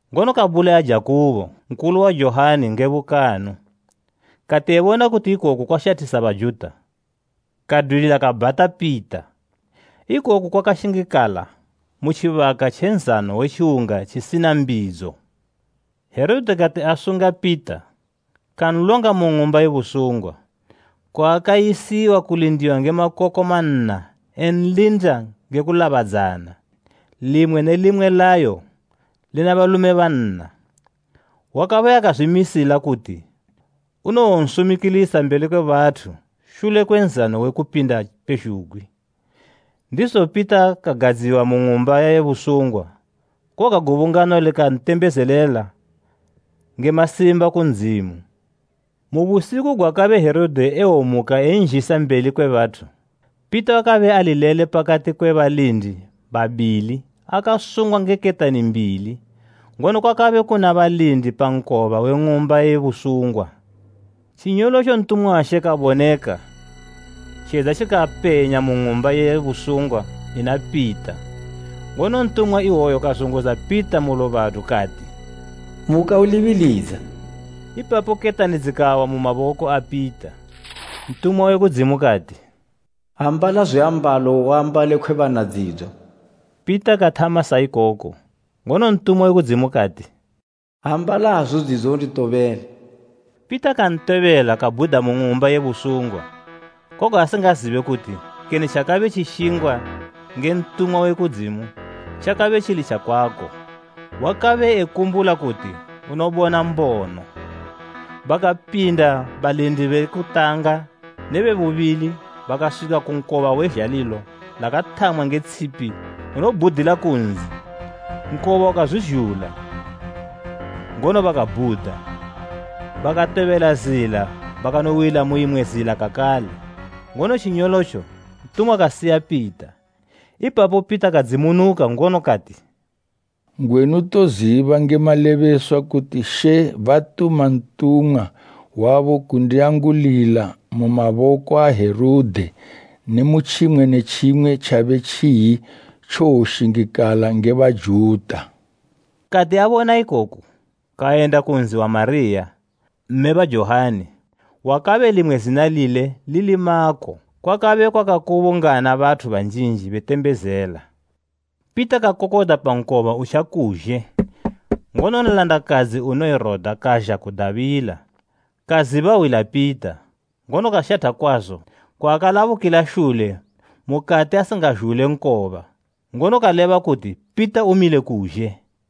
Ngono kabulaya Jakubo nkulu wa Johani nge bukanu. Kati ebona kuti ikoku kwashathisa Bajuta, kadwilila kabhata Pita. Ikoku kwakashingikala mu tjibaka tje Nzano we Tjiwunga tjisina mbidzo. Herode kati asunga Pita kanlonga mu ng'umba ye busungwa, kwaakayisiwa kulindiwa nge makoko manna enlinda nge kulabadzana, limwe ne limwe layo lina balume banna. Wakabe akazwimisila kuti unowonsumikilisa mbeli kwe bathu shule kwe Nzano we Kupinda pezhugwi. Ndizo Pita kagadziwa mu ng'umba ye busungwa, koga gubungano likantembezelela nge masimba ku Ndzimu. Mu busiku gwakabe Herode ewomuka enzhisa mbeli kwe bathu, Pita wakabe ali lele pakati kwe balindi babili akasungwa nge ketani mbili, ngono kwakabe kuna balindi pa nkoba we ng'umba ye busungwa. Tjinyolotjo ntumwa wa She kaboneka, tjedza tjikapenya mu ng'umba ye busungwa ina Pita ngono ntumwa iwoyo kazunguza Pita mu lubadu kati, “Muka ulibilidza.” Ipapo ketani dzikawa mu maboko a Pita. Ntumwa we kudzimu kati, “Ambala zwiambalo uambale khwebana dzidzo.” Pita kathama sa ikoko, ngono ntumwa we kudzimu kati, “Ambala hazu dzidzo unditobele.” Pita kantobela kabhuda mu ng'umba ye busungwa, koga asingazibe kuti kene tjakabe tjishingwa nge ntumwa we kudzimu tjakabe tjili tjakwako; wakabe ekumbula kuti unobona mbono. Bakapinda balindi be kutanga ne be bubili bakaswika ku nkoba we zhalilo lakathamwa nge tshipi unobhudila ku nzi. Nkoba ukazwizhula, ngono bakabhuda. Bakatobela zila bakanowila mu imwe zila kakale, ngono tjinyolotjo ntumwa kasiya Pita. Ipapo Pita kadzimunuka ngono kati, “Ngwenu ndoziba nge malebeswa kuti She batuma ntumwa wabo kundiangulila mu maboko a Herode ne mu tjimwe ne tjimwe tjabe tjiyi tjowoshingikala nge Bajuta.” Kati abona ikoku, kayenda ku nzi wa Mariya, mme ba Johani wakabe limwe zina lile lili Mako, kwakabe kwakakubungana bathu banjinji betembezela. Pita kakokodza pa nkoba utjakuzhe, ngono nlandakadzi unoyi Roda kazha kudabila. Kaziba hwi la Pita, ngono kashatha kwazo kwaakalabukila shule mukati asingazhule nkoba, ngono kaleba kuti Pita umile kuzhe.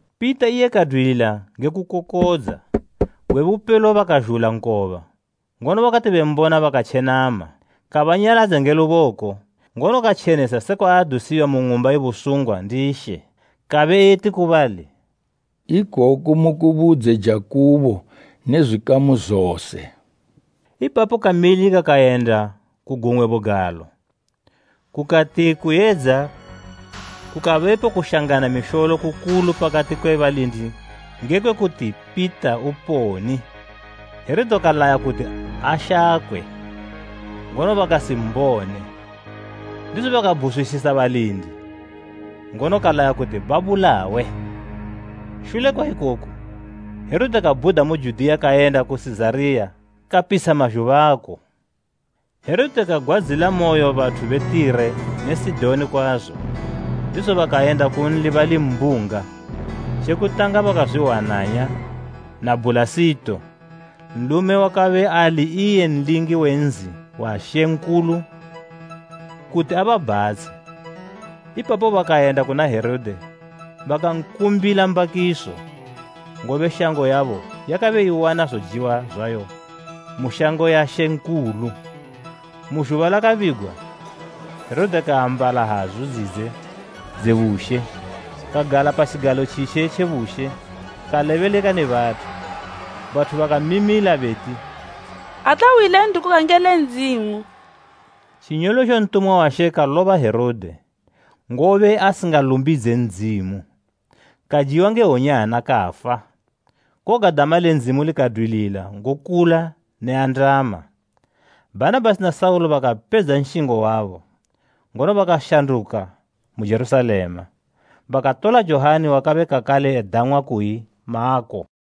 Pita iye kadwilila nge kukokodza. Gwe bupelo bakazhula nkoba, ngono bakati bembona bakatjenama. Kabanyaladza nge luboko, ngono katjenesa sekwa adusiwa mu ng'umba ye busungwa ndi She. Kabe eti ku bali, “Ikoku mukubudze Jakubo ne zwikamu zose.” Ipapo kamilika kayenda ku gumwe bugalo. Kukati kuyedza kukabepo kushangana misholo kukulu pakati kwe balindi ngekwe kuti Pita uponi. Herode kalaya kuti ashakwe, ngono bakasimbone. Ndizo kabhuzwisisa balindi, ngono kalaya kuti babulawe. Shule kwa ikoku, Herode kabhuda mu Judiya kayenda ku Sizariya kapitsha mazhubako. Herode kagwadzilamoyo bathu be Tire ne Sidoni kwazo, ndizo bakayenda kunli bali mbunga. Tje kutanga bakazwihwananya na Bhulasito, nlume wakabe ali iye nlingi we nzi wa Mambo kuti ababhatshe. Ipapo bakayenda kuna Herode bakankumbila mbakiso, ngobe shango yabo yakabe iwana zojiwa zwayo mu shango ya Mambo. Mu zhuba lakabigwa Herode kaambala hazu dzidze dze bushe, kagala pa tjigalo tjitje tje bushe kalebeleka ne bathu. Bathu bakamimila beti, “Ate hwi le nthu koga ngele ndzimu!” Tjinyolotjo ntumwa wa She kaloba Herode, ngobe asingalumbidze Ndzimu. Kajiwa nge wonyana kafa. Koga dama le Ndzimu likadwilila ngokula ne andama. Bhanabhasi na Saulo bakapedza nshingo wabo, ngono bakashanduka mu Jerusalema, bakatola Johani wakabe kakale edang'wa kuyi Mako.